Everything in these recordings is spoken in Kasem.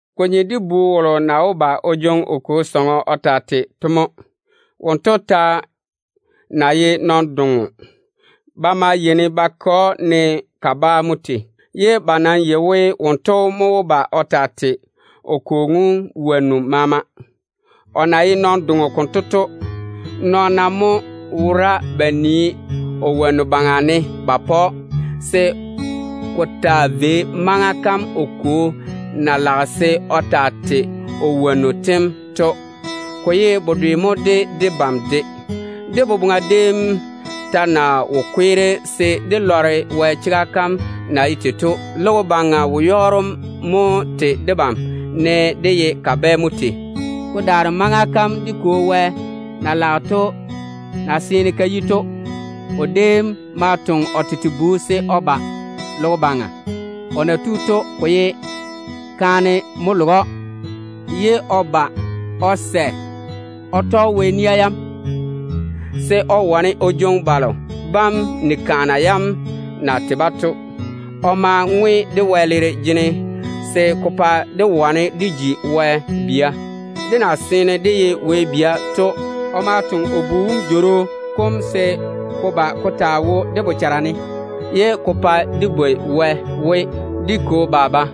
Ko nye de bu wolo na wó ba o jwoŋi o kwo sɔŋɔ o taa tei to mo. Wonto ta ná ye nɔn-doŋo, ba maa yeini ba ke‑o ne kabaa mo tei, ye ba nam yei we wonto mo wó ba o taa tei o kwo wonnu maama. O na ye nɔn-doŋo konto to, nɔɔna mo wora ba na nii o wonnu baŋa ne ba pa‑o, se ko taa vei maŋa kam o kwo na kuri se o taa tei o wonnu tem to. Ko ye bedwe mo de debam de. Dé boboŋa déem ta na wo kweere se dé lɔre Wɛ chega kam na ye tei to, logo baŋa wo-yɔɔro mo tei debam ne dé ye kabɛ mo tei. Ko daare maŋa kam dé Kwo Wɛ na kuri to na seene ka yi to mo o déem toŋe o tete Bu se o ba logo baŋa. O na tu to, ko ye kaane mo loge‑o, ye o sɛ o tɔge Wɛ nia yam, se o wane o jwoŋi balo bam ni-kaana yam na tei to. O ma ŋwe dé wɛleera jene se ko pa dé wane dé ji Wɛ bia. Dé na seene dé ye Wɛ bia to, o ma toŋe o Bu wom Jworo kom se ko ba ko taa wo dé bochara ne, ye ko pae dé bwoi Wɛ we, “Dé Kwo, Baba.”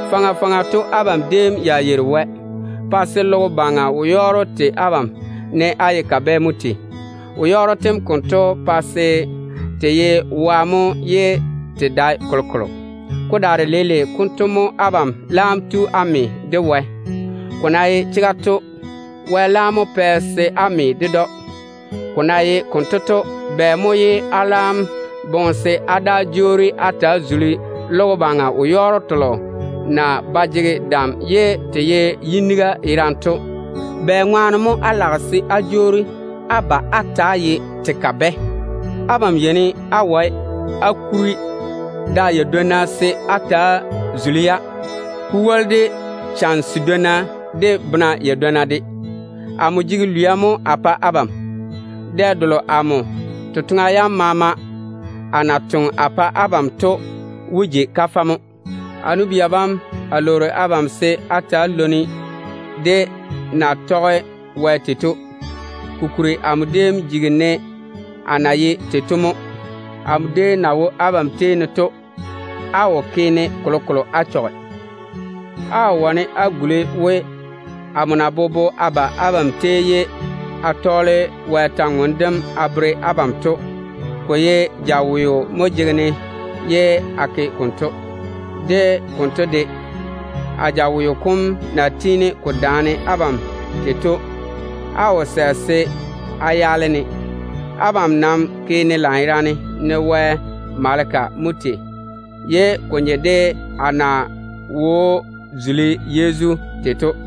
Faŋa faŋa to abam déem ya yeiri Wɛ, pa se logo baŋa wo-yɔɔro tei abam ne á ye kabɛ mo tei. Wo-yɔɔro tem konto pae se te ye wa mo ye te dae kolokolo. Ko daare leile konto mo abam laam tu á lɔre Wɛ. Ko na ye chega to, Wɛ mo pɛ abam chwoŋa se á lɔre‑o. Ko na ye konto to, bɛ mo ye á laam boŋe se á daa jwoori á ta‑á zuli logo baŋa wo-yɔɔro telo na ba jege dam ye te ye yiniga yerane to? Bɛŋwaane mo á lage se á jwoori á ba á ta‑á ye te kabɛ? Abam yeini á wae á kuri da yadwonna se á ta‑á zuli-ya, ko woli de chane sedwonna, de bena yadwonna de. Amo jege lwia mo a pae abam. Dɛ delo amo totoŋa yam maama a na toŋe a pa abam to wó ji kafɛ mo. A nu-bia bam, a lwoori abam se á ta‑á lwoni-ne de a na tɔge Wɛ tei to. Kokuri amo déem jigi ne á na ye tei to mo. Amo déem na wo abam tei ne to, á wo ke kolokolo á ma á chɔge a yiga. Á wó wane á guli we, amo na bobo a ba abam tei ye a tɔɔle Wɛ kwor-ywoŋa kam a bere abam to, ko ye jaweo mo jege-ne ye a ke konto. De konto de, a jaweo kom na tiini ko daane abam tei to, á wo sɛ se á yaale-ne. Abam nam ke-ne lanyerane, ne a ye Wɛ maleka mo tei. Ko maa nye de á na wó zuli Yezu Krista tete tei to.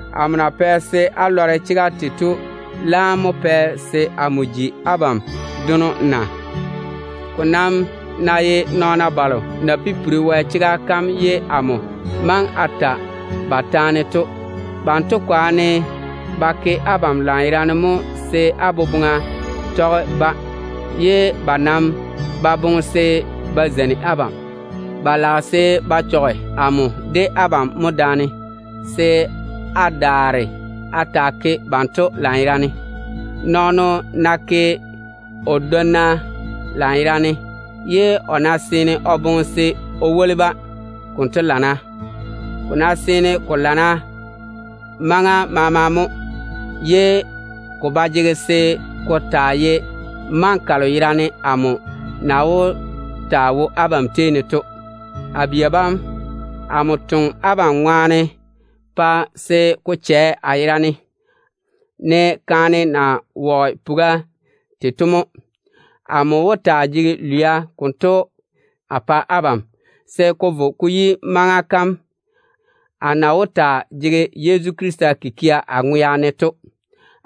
Amo na pɛ se á lɔre chega kam to ŋwaane mo pɛ se a ji abam dono na? Ko nam ná ye nɔɔna balo na pipiri Wɛ chega kam ye amo maŋe a ta ba taane to, banto kwaane ba ke abam lanyerane mo se á boboŋa tɔge-ba, ye ba nam ba boŋe se ba zeini abam. Ba lage se ba chɔge amo de abam mo daane, se á daare á ta‑á ke banto lanyerane. Nɔɔno ná ke o dwonna lanyerane, ye o ná seene o boŋe se o woli-ba, konto lana. Ko seene ko lana maŋa maama mo, ye ko ba jege se ko taa ye maŋa kalo yerane amo na wó taa wo abam tei ne to. A bia bam, amo toŋe abam ŋwaane pa se ko chɛ a yera ne, ne kaane na virigi puga tei to mo. Amo wó taa jege lwia konto a pa abam, se ko vo ko yi maŋa kam á na wó ta‑á jege Yezu Krista kikia á ŋwea ne to.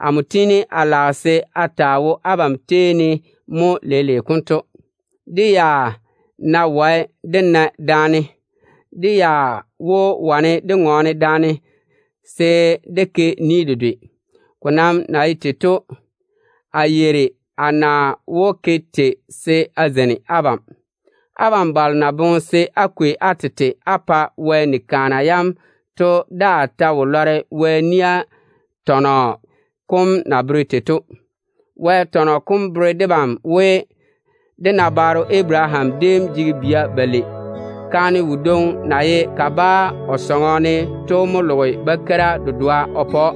Amo tiini a lage se a taa wo abam tei ne mo leile konto. Dé ya ná wae dé na daane, dé ya wó wane dé ŋɔɔne daane se dé ke ni dedwe. Ko nam na ye tei to, a yeiri a na wó ke tei se a zeini abam. Abam balo na boŋe se á kwei á tete á pa Wɛ ni-kaana yam to daa ta wo lɔre Wɛ nia tɔnɔ kom na bere tei to. Wɛ tɔnɔ kom bere debam we, dé nabaaro Abaraham déem jege bia balei. Kaane wodwoŋi na ye kabaa o sɔŋɔ ne to mo loge bakeira dedoa o pa‑o.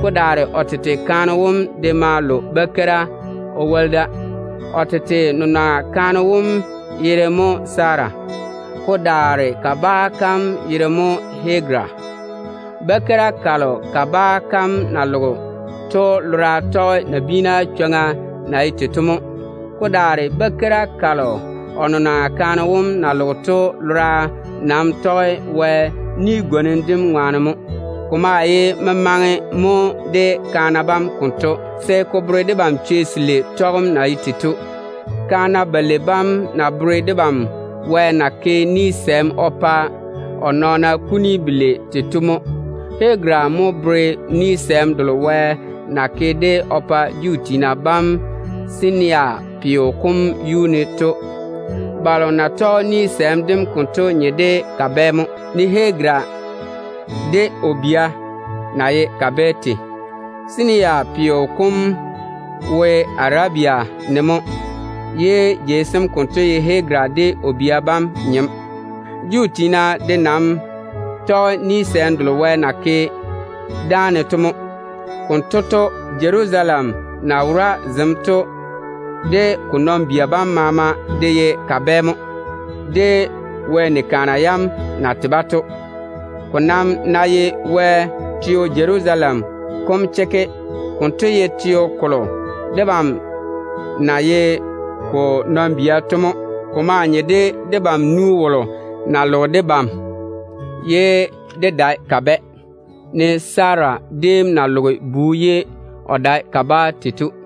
Ko daare o tete kaane wom de ma lo bakeira o woli da. O tete nenɔŋa kaane wom yere mo Sara, ko daare kabaa kam yere mo Hagara. Bakeira kalo kabaa kam na loge to lora tɔge nabiina chwoŋa na ye tei to mo. Ko daare bakeira kalo o nenɔŋa kaane wom na loge to lora nam tɔge Wɛ kampwola kam ŋwaane mo. Ko maa ye memaŋe mo de kaana bam konto, se ko bere debam chwei selei tɔgem na ye tei to. Kaana balei bam ta bere debam Wɛ na gwoni ni de o nɔɔna kuni belei tei to mo. Hagara mo bere ni-gwonim delo Wɛ na ke o pa Juu tiina bam Sinayi peo kom yuu ne to. Balo na tɔge ni-gwonim dem konto nye de kabɛ mo, ne Hagara de o bia na ye kabɛ tei. Sinayi peo kom wo Arabia ne mo, ye jei sem konto ye Hagara de o bia bam nyem. Juu tiina de nam tɔge ni-gwonim delo Wɛ na ke dáane to mo. Konto to, Jerusalem na wora zem to de ko nɔn-bia bam maama de ye kabɛ mo, de Wɛ ni-kaana yam na tei-ba to. Ko nam ná ye Wɛ teo Jerusalem kom chekke, konto ye teo kolo debam na ye ko nɔn-bia to mo. Ko maa nye de debam nu wolo na loge debam ye dé dae kabɛ, ne Sara déem na loge bu ye o dae kabaa tei to.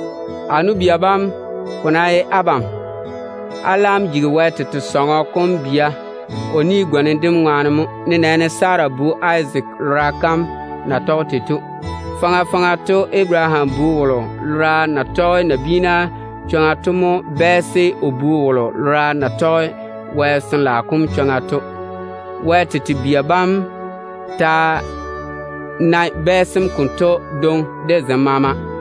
A nu-bia bam, ko ná ye abam, á laam jigi Wɛ tete sɔŋɔ kom bia o kampwola kam ŋwaane mo, nenɛɛne Sara bu Izaak lora kam na tɔge tei to. Faŋa faŋa to Abaraham bu wolo lora na tɔge nabiina chwoŋa to mo bɛɛse o bu wolo lora na tɔge Wɛ Sin-laao kom chwoŋa to. Wɛ tete bia bam ta nae bɛɛsem konto dwoŋi de zem maama.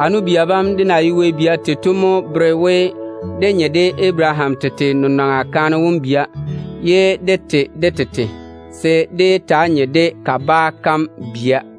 A nu-bia bam, dé na ye Wɛ bia tei to mo bere we dé nye de Abaraham tete nenɔŋa kaane wom bia ye dé tei de tete, se dé yé taa nye de kabaa kam bia.